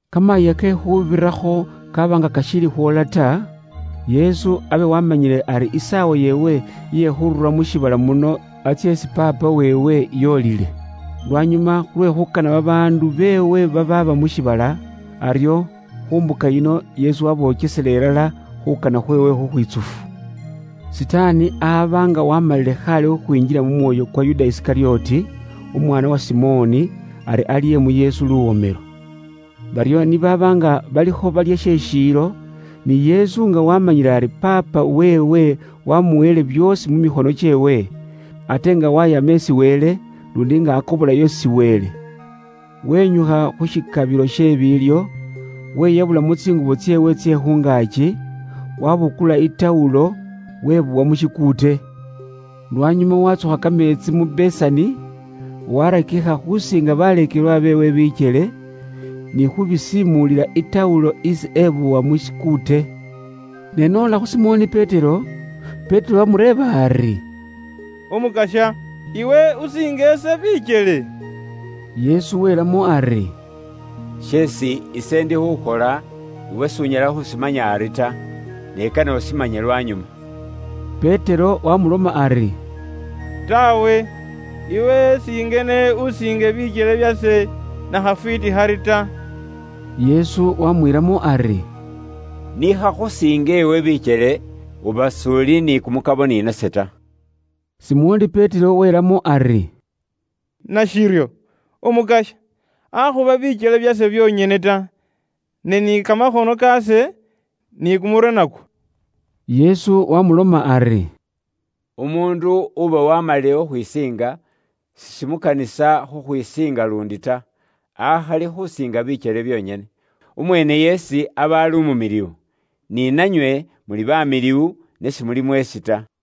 Kamayiiya ke Khuubirakho kaaba nga kashiili khwoola ta, Yesu abe waamanyile ari isaawa yeewe iye khurura mu shiibala muno atsye isi Paapa weewe, yoolile. Lwanyuma khulwe khuukana babaandu beewe babaaba mu shiibala, aryo khu mbuka yino Yesu wabokesela ilala khuukana khweewe khukhwitsufu. Sitaani aba nga waamalile khaale khukhwinjila mu mwoyo kwa Yuda Isikalyoti, umwaana uwa Simoni, ari alye mu Yesu luwomelo. Baryo ni baaba nga balikho balya she shiilo, ni Yesu nga waamanyile ari Paapa weewe wamuweele byoosi mu mikhono kyeewe, ate nga wayama isi Wele, luundi nga akobolayo isi Wele; wenyukha khu shikabilo she biilyo, wiyabulamo tsingubo tseewe tsye khu ngaaki, wabukula i tawulo wibowa mu shikuute. Lwanyuma watsukha kameetsi mu besani, warakikha khusiinga baleekelwa beewe bikyele, ni khubisiimulila i tawulo isi ebowa mu shikuute. Ne n'ola khu Simoni Petero, Petero waamureeba ari, “Umukasya, iwe usiinge ise bikyele?” Yesu wilamo ari, “Sheesi ise ndi khukhola, iwe s'unyala khushimanya ari ta. Ne kane ushimanye lwanyuma.” Petero wamuloma ari, “Taawe, iwe singene usiinge bikyele byase nakhafwiiti khari ta!” Yesu wamwiilamo ari, “Nikhakhusiinga iwe bikyele, uba s'uli ni kumukabo ni nase ta.” Simoni Petero wiilamo ari, “Nashiryo, Umukasya, akhuba bikyele byase byonyene ta, ne ni kamakhono kaase, ni kumurwe nakwo.” Yesu wamuloma ari, “Umuundu uba waamalile khukhwisiinga, sishimukanisa khukhwisiinga luundi ta. Akhali khusiinga bikyele byonyene. Umweene yeesi aba ali umumiliwu. Ni nanywe muli bamiliwu, ne simuli mweesi ta.”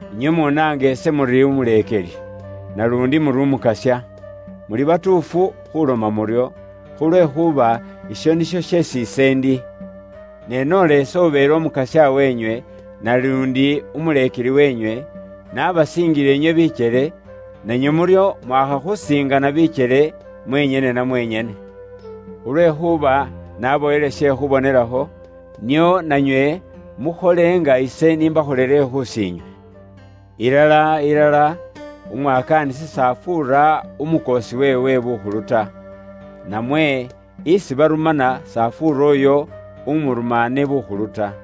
Inywe munaanga ise muri Umuleekeli, naluundi muri Umukasya. Muli batuufu khuloma muryo, khulwekhuuba isho nisho sheesi ise ndi. Ne noola ise ubeele Umukasya wenywe, naluundi Umuleekeli wenywe, nabasiingile inywe bikyele, nanywe muryo mwaakha khusiingana bikyele, mwenyene na mwenyene. Khulwekhuuba nabaweele she khubonelakho, nio nanywe mukhole nga ise n'ishikholele khus'inywe. Ilala, ilala, umwakaanisi s'afuura umukoosi weewe bukhulu ta. Namwe umurume s'afuura uyo umurumaane bukhulu ta.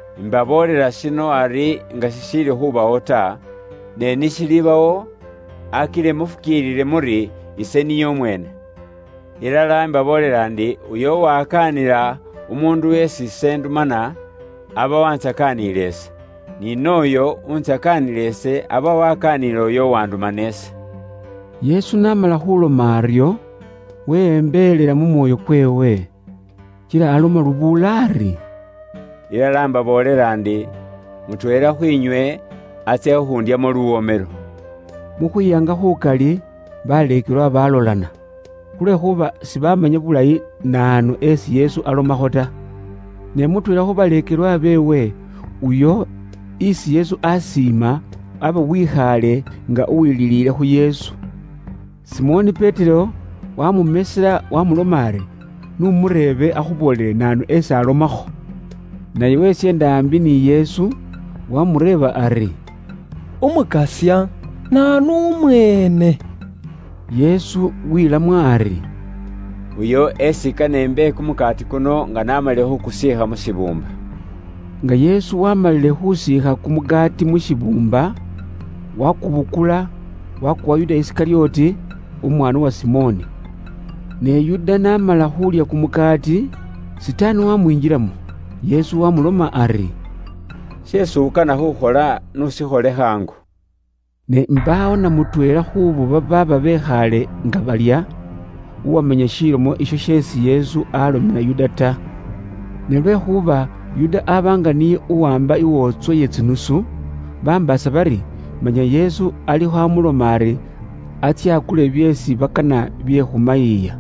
Imbaboolela shino ari nga shishiili khubawo ta, ne ni shilibawo, akile mufukiilile muri ise niye umweene. Ilala imbaboolela ndi, uyo uwakaanila umuundu isi ise ndumana, aba wantsakaaniile ise. Ni nooyo uwuntsakaanila ise, aba wakaaniile uyo uwandumana ise.” Yesu n'amala khuloma aryo, wiyembelela mu mwoyo kweewe, kila aloma lubuula ari, “Ilala mbaboolela ndi, mutweela khwinywe atsya khundyamo luwomelo.” Mu khwiyanga khukali, baleekelwa balolana. Khulwekhuuba sibamanya bulayi naanu esi Yesu alomakho ta. Ne mutweela khu baleekelwa beewe, uyo isi Yesu aakana naabi, aba wikhaale nga uwililiile khu Yesu. Simoni Petero waamumesela, waamuloma ari, “N'umureebe akhuboolele ifwe naanu esi alomakho.” Naye wesyeenda aambi ni Yesu, waamureeba ari, “Umukasya, naanu umweene?” Yesu wiilamo ari, “Uyo esi kane imbe kumukaati kuno nga naamalile khuukusiikha mu shibuumba.” Nga Yesu waamalile khusiikha kumukaati mu shibuumba, wakubukula, wakuwa Yuda Isikalyoti, umwaana uwa Simoni. Ne Yuda n'amala khuulya kumukaati, Sitaani wamwingilamo. Yesu wamuloma ari, “Sheesi ukana khukhola, n'ushikhole khaangu.” Ne mbaawo na mutweela khuubo babaaba bekhaale nga balya, uwamanya shilomo isho sheesi Yesu alomela Yuda ta. Ne lwekhuuba Yuda aba nga niye uwaamba iwootswa iye tsinusu, bambaasa bari manya Yesu alikho amuloma ari atsye akule byeesi bakana bye khu mayiiya.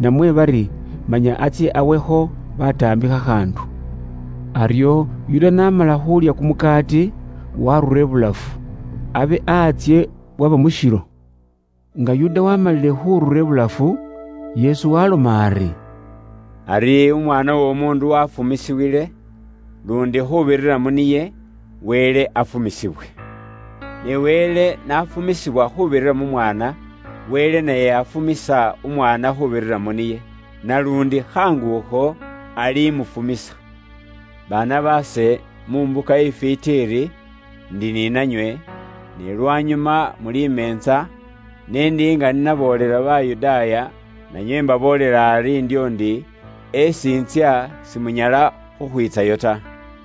Namwe bari manya atsye awekho bataambi khakhaandu. Aryo Yuda n'amala khuulya kumukaati waarura ibulafu. Abe antsye bwaba mushilo. Nga Yuda waamalile khurura ibulafu, Yesu waaloma ari, “Ari Umwaana w'Omuundu waafumisiwile. Luundi khuubirira mu niye, Wele afumisibwe. Ne Wele n'afumisibwa khuubirira mu Mwaana, Wele naye afumisa Umwaana khuubirira mu niye. Naluundi khaangu akho, alimufumisa. Baana baase, mu mbuka ifwiiti iri, ndi ni nanywe, ne lwanyuma muli meentsa, ne ndi nga ni naboolela Bayudaaya, nanywe mbaboolela ari ndyo ndi, esi intsya, simunyala khukhwiitsayo ta.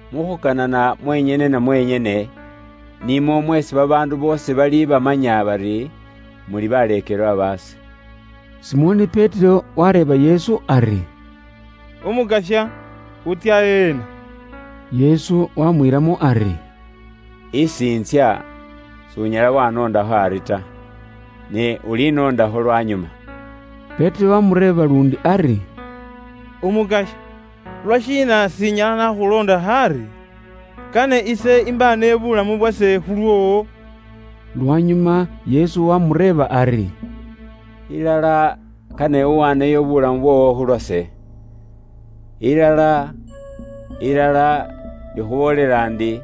Mu khukanana mwenyene na mwenyene, nimwo mweesi babaandu boosi balibamanya bari muli baleekelwa baase.” Simoni Petero wareeba Yesu ari, “Umukasya, wutsya ena?” Yesu wamwiilamo ari, “Isi intsya, s'unyala wanondakho ari ta. Ne ulinoondakho lwanyuma.” Petero waamureeba luundi ari, “Umukasya, lwashiina s'inyala naakhuloondakho ari? Kane ise imbaaneyo buulamu bwase khulwoowo.” Lwanyuma Yesu waamureeba ari, “Ilala, kane uwaaneyo bulamu bwoowo khulwase? Ilala, ilala, ikhuboolela ndi,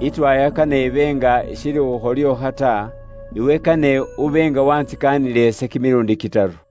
itwaaya kane ibe nga ishiili khukholyookha ta, iwe kane ube nga waantsikaanile ise kimiluundi kitaru.”